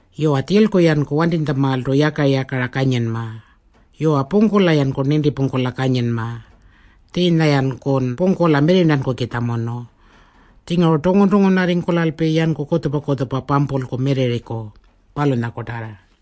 Yuwa, tjilku-yanku wantinytjamaaltu yaka-yakara kanyinma. Yuwa, pungkula-yanku nintipungkula kanyinma. Tjiinya-yankun pungkula mirrirntankukitjamunu. Tjinguru tungun-tungunarringkulalpi yanku kutjupa-kutjupa pampulku mirrirriku, palunyakutarrartu.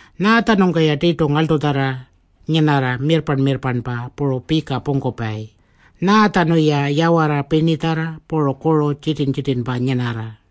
Nyaatjanungka-ya tirtu ngarltutjarra nyinarra mirrparn-mirrparnpa puru pika pungkupayi? Nyaatjanu-ya yawarra pirnitjarra puru kuru tjitirn-tjitirnpa nyinarra?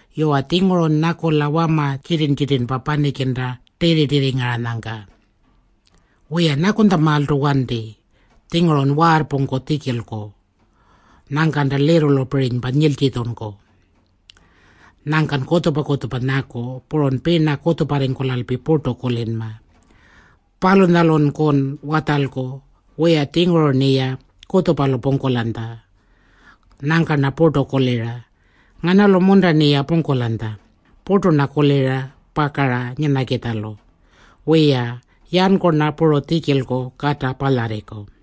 Yuwa, tjingurun nyakula wama tjitirn-tjitirnpa panikinta tirri-tirrirranyangka. Wiya, nyakunytjamaaltu wanti. Tjingurun waarrpungku tjikilku. Nyangkanta lirrulupirinypa nyiltjitjunku. Nyangkan kutjupa-kutjupa nyaku. Purun pina kutjuparringkulalpi purtu kulinma. Palunyalunkun watjalku, “Wiya-tjinguru-rniya kutjupalu pungkulanytja. Nyangka-rna purtu kulira, ‘Nganalu-munta-rniya pungkulanytja?’ Purtu-rna kulira pakara nyinakitjalu. Wiya, yanku-rna puru tjikilku kata palyarriku.”